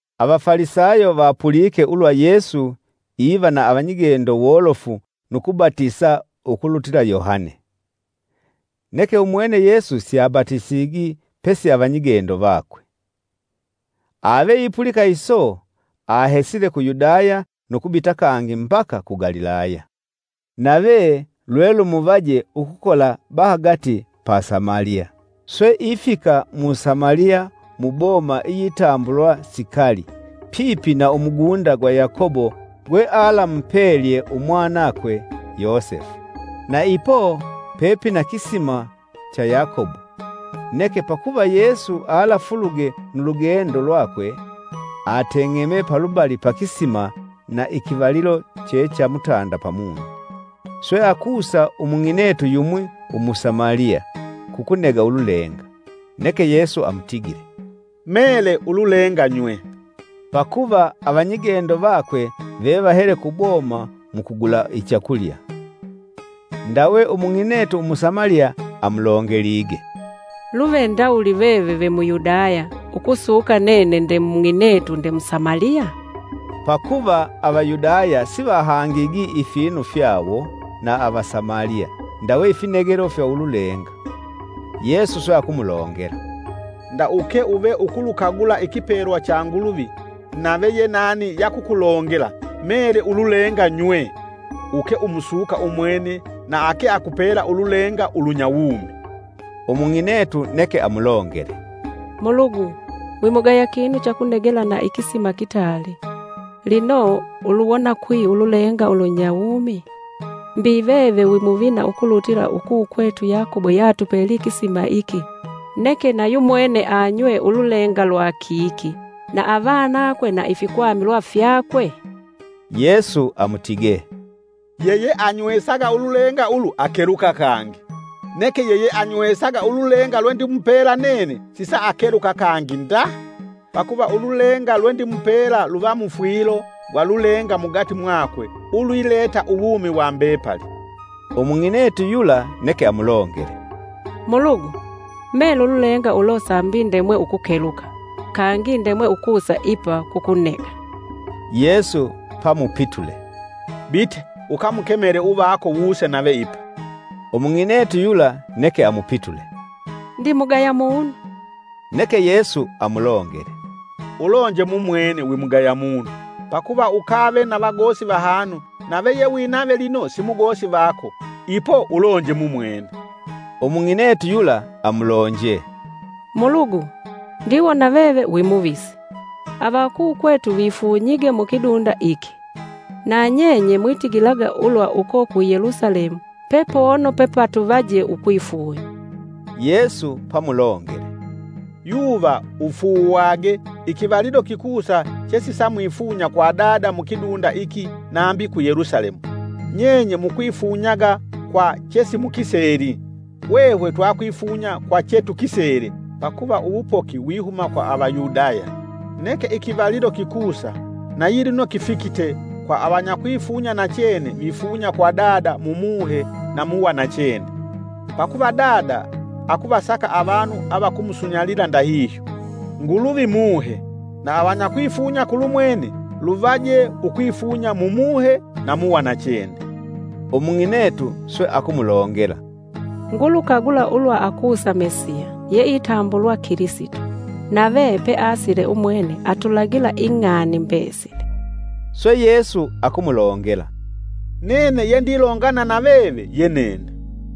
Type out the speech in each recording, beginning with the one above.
Avafalisayo vapulike ulwa Yesu iva na avanyigendo wolofu nukubatisa ukulutila Yohane. ( Neke umwene Yesu siabatisigi pesi avanyigendo vakwe.) Aveipulika iso ahesile ku Yudaya nu kubita kangi mbaka ku Galilaya. Nave lwelumuvaje ukukola bahagati pa Samaliya. Swe ifika mu Samaliya mu boma iyitambulwa Sikali pipi na umugunda gwa Yakobo gwe alamupelye umwanakwe, Yosefu. Na ipo pepina kisima cha Yakobo, neke pakuva Yesu alafuluge nu lugendo lwakwe, ateng'eme palubali pa kisima na ikivalilo che cha mutanda pamunyi. Swe akusa Umung'inetu yumwi Umusamaliya kukunega ululenga. Neke Yesu amutigile, “Mele ululenga nywe.” ( Pakuva avanyigendo vakwe vevahele kuboma mukugula ichakulya.) Ndawe Umung'inetu Umusamaliya amulongelige, “Luve ndawuli veve ve Muyudaya; ukusuka nene nde mung'inetu nde Musamaliya?” (Pakuva Avayudaya sivahangigi ifinu fyawo na Avasamaliya ndawe ifinegelo fya ululenga.) Yesu swe akumulongela, “Nda uke uve ukulukagula ikipelwa cha Nguluvi nave ye nani yakukulongela: ‘Mele ululenga nywe,’ uke ukumusuka umwene na ake akupela ululenga ulunya wumi.” Umung'inetu neke amulongele, “Mulugu wimugaya kinu chakunegela na ikisima kitaali, lino uluwona kwi ululenga ulunya wumi? Mbi veve wimuvina ukulutila ukukwetu Yakobo yeatupelye ikisima iki, neke na yumwene anywe ululenga lwa kiki na avanakwe na ifikwamilwa fyakwe?” Yesu amutige, “Yeyeanywesaga ululenga ulu akeluka kangi. Neke yeyeanywesaga ululenga lwe ndimupela nene sisaakeluka kangi nda. Pakuva ululenga lwe ndimupela luva mufwilo gwa lulenga mugati mwakwe ulwileta uwumi wa mbepali.” Umung'inetu yula neke amulongele, “Mulugu, mele ululenga ulo sambi ndemwe ukukeluka kangi ndemwe ukusa ipa kukunega.” Yesu pamupitule, “Bite, ukamukemele uvako wuse nave ipa.” Umung'inetu yula neke amupitule, “Ndimugaya munu.” Neke Yesu amulongele, “Ulonje mumwene wimugaya munu. Pakuva ukave na vagosi vahanu nave ye winave lino simugosi vako, ipo ulonje mumwene.” Umung'inetu yula amulonje, “Mulugu, ndiwona veve wimuvisi. Avakukwetu vifunyige mukidunda iki, na nyenye mwitigilaga ulwa uko ku Yelusalemu pepono pepatuvaje ukwifunya.” Yesu pamulongele, “Yuva ufuuwage ikivalilo kikusa chesisamwifunya kwa Dada mukidunda iki nambi ku Yelusalemu. Nyenye mwikwifunyaga kwa chesimukiseli, hwehwe twakwifunya kwa che tukisele pakuva uwupoki wihuma kwa Avayudaya. Neke ikivalilo kikusa na yilino kifikite kwa avanyakwifunya nachene vifunya kwa Dada mu Muhe na mu wanachene. Pakuva Dada akuvasaka avanu avakumusunyalila ndahihyo. Nguluvi Muhe, na avanyakwifunya kulu mwene luvaje ukwifunya mu Muhe na muwanachene.” Umung'inetu swe akumulongela, “Ngulukagula ulwa akusa Mesiya yeitambulwa Kilisito nave peasile umwene atulagila ing'ani mbesili.” Swe Yesu akumulongela, “Nene yendilongana na veve ye nene.”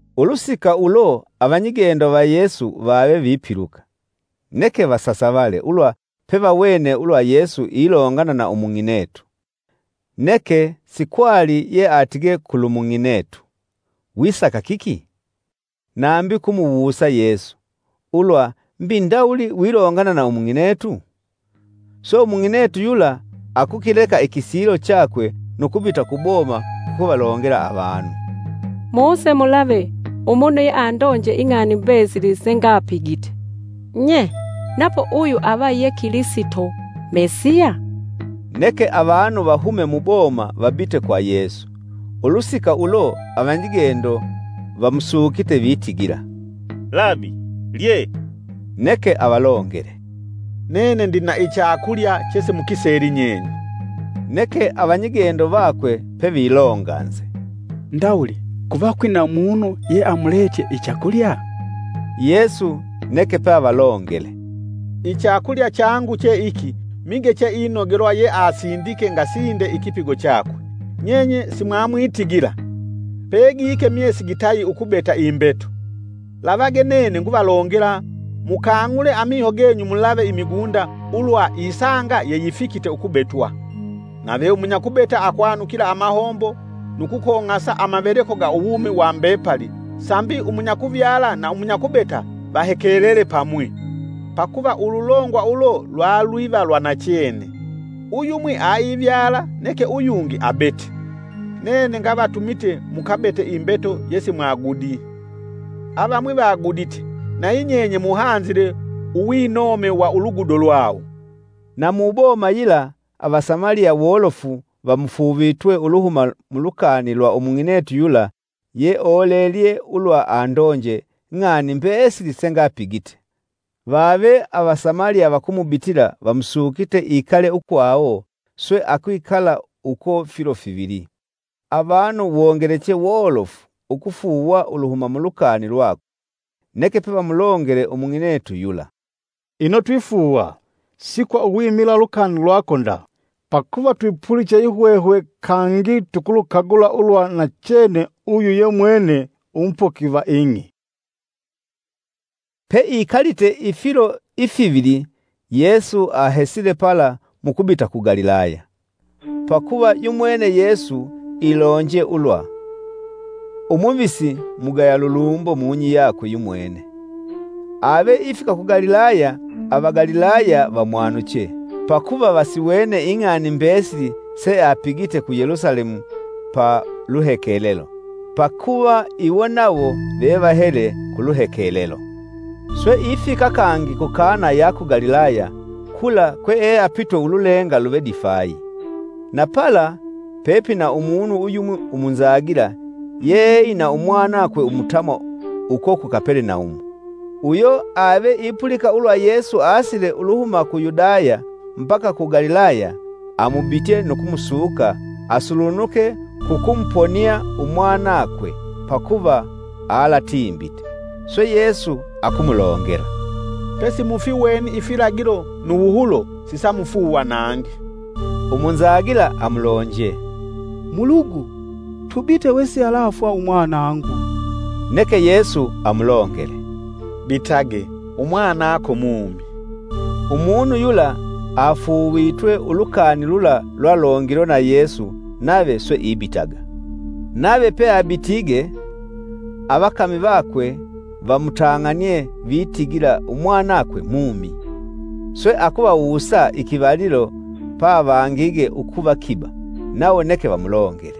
Ulusika ulo avanyigendo va Yesu vave vipiluka, neke vasasavale ulwa pevawene ulwa Yesu ilongana na umung'inetu. Neke sikwali yeatige kulu mung'inetu: “Wisaka kiki?” Nambi kumuwusa Yesu, “Ulwa mbi ndawuli wilongana na umung'inetu?” Swe umung'inetu yula akukileka ikisilo chakwe nu kubita ku boma kukuvalongela avanu. “Muse mulave umunu yeandonje ing'ani mbesili sengapigite! Nye! Napo uyu ava ye Kilisito Mesiya?” Neke avanu vahume muboma vabite kwa Yesu. Ulusika ulo avanyigendo vamusukite vitigila, “Labi, lye.” Neke avalongele, “Nene ndina ichakulya chesimukiseli nyenye.” Neke avanyigendo vakwe pevilonganze, “Ndawuli kuva kwina munu yeamuletye ichakulya?” Yesu neke pavalongele, “Ichakulya changu che iki mige cheinogelwa yeasindike ngasinde ikipigo chakwe. Nyenye simwamwitigila: ‘Pegike myesi gitayi ukubeta imbeto!’ Lavage nene nguvalongela mukang'ule amiho genyu mulave imigunda ulwa isanga yeyifikite ukubetwa. Nave umunyakubeta akwanukila amahombo nu kukong'asa amaveleko ga uwumi wa mbepali sambi umunyakuvyala na umunyakubeta vahekelele pamwi. Pakuva ululongwa ulo lwalwiva lwa nachene, ‘Uyumwi aivyala neke uyungi abete.’ Nene ngavatumite mukabete imbeto yesimwagudi, avamwi vagudite nayi nyenye muhanzile uwinome wa ulugudo lwawo.” Na mu boma yila Avasamaliya wolofu vamufuuvitwe uluhuma mu lukani lwa umung'inetu yula yeolelye ulwa andonje: “Ng'ani mbesili sengapigite.” Vave Avasamaliya vakumubitila vamusukite ikale ukwawo, swe akwikala uko filo fivili. Avanu wongeleche wolofu ukufuuwa uluhuma mulukani lwakwe. Neke pevamulongele umung'inetu yula, “Ino twifuuwa, si kwa uwimila ulukani lwako nda. Pakuva twipuliche yihwehwe kangi tukulukagula ulwa nachene uyu ye mwene Umupoki va ing'i.” Peikalite ifilo ifivili Yesu ahesile pala nu kubita ku Galilaya. Pakuva yumwene Yesu ilonje ulwa, “Umuvisi mugaya lulumbo mung'i yakwe yumwene.” Ave ifika ku Galilaya, Avagalilaya vamwanuche. Pakuva vasiwene ing'ani mbesili seapigite ku Yelusalemu pa luhekelelo pakuva iwo nawo vevahele kuluhekelelo. Swe ifika kangi ku Kana ya ku Galilaya, kula kweeapitwe ululenga luve difayi. Na pala pepina umunu uyumwi umunzagila yeeina umwanakwe umutamwa uko ku Kapelenaumu. Uyo ave ipulika ulwa Yesu asile uluhuma ku Yudaya mbaka ku Galilaya amubitye nu kumusuka asulunuke kukumuponia umwanakwe, pakuva alatimbite. Swe Yesu akumulongela, “Pesimufiweni ifilagilo nu wuhulo sisamufuuwa nangi.” Umunzagila amulonje, “Mulugu tubite wesialafwa umwanangu.” Neke Yesu amulongele, “Bitage umwanako mumi.” Umunu yula afuuvitwe ulukani lula lwalongilwe na Yesu nave swe ibitaga. Nave peabitige avakami vakwe vamutang'anie vitigila umwanakwe mumi. Swe akuvawusa ikivalilo pavangige ukuva kiba nawo neke vamulongele,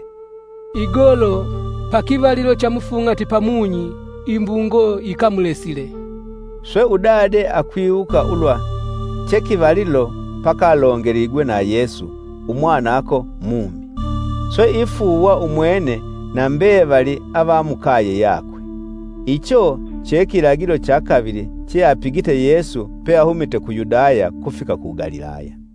“Igolo, pa kivalilo cha mufung'ati pamunyi, imbungo yikamulesile.” Swe udade akwiwuka ulwa chekivalilo pakalongeligwe na Yesu: “Umwanako mumi.” Swe ifuuwa umwene na mbevali avamukaye yakwe. Icho che kilagilo cha kavili cheapigite Yesu peahumite ku Yudaya kufika ku Galilaya.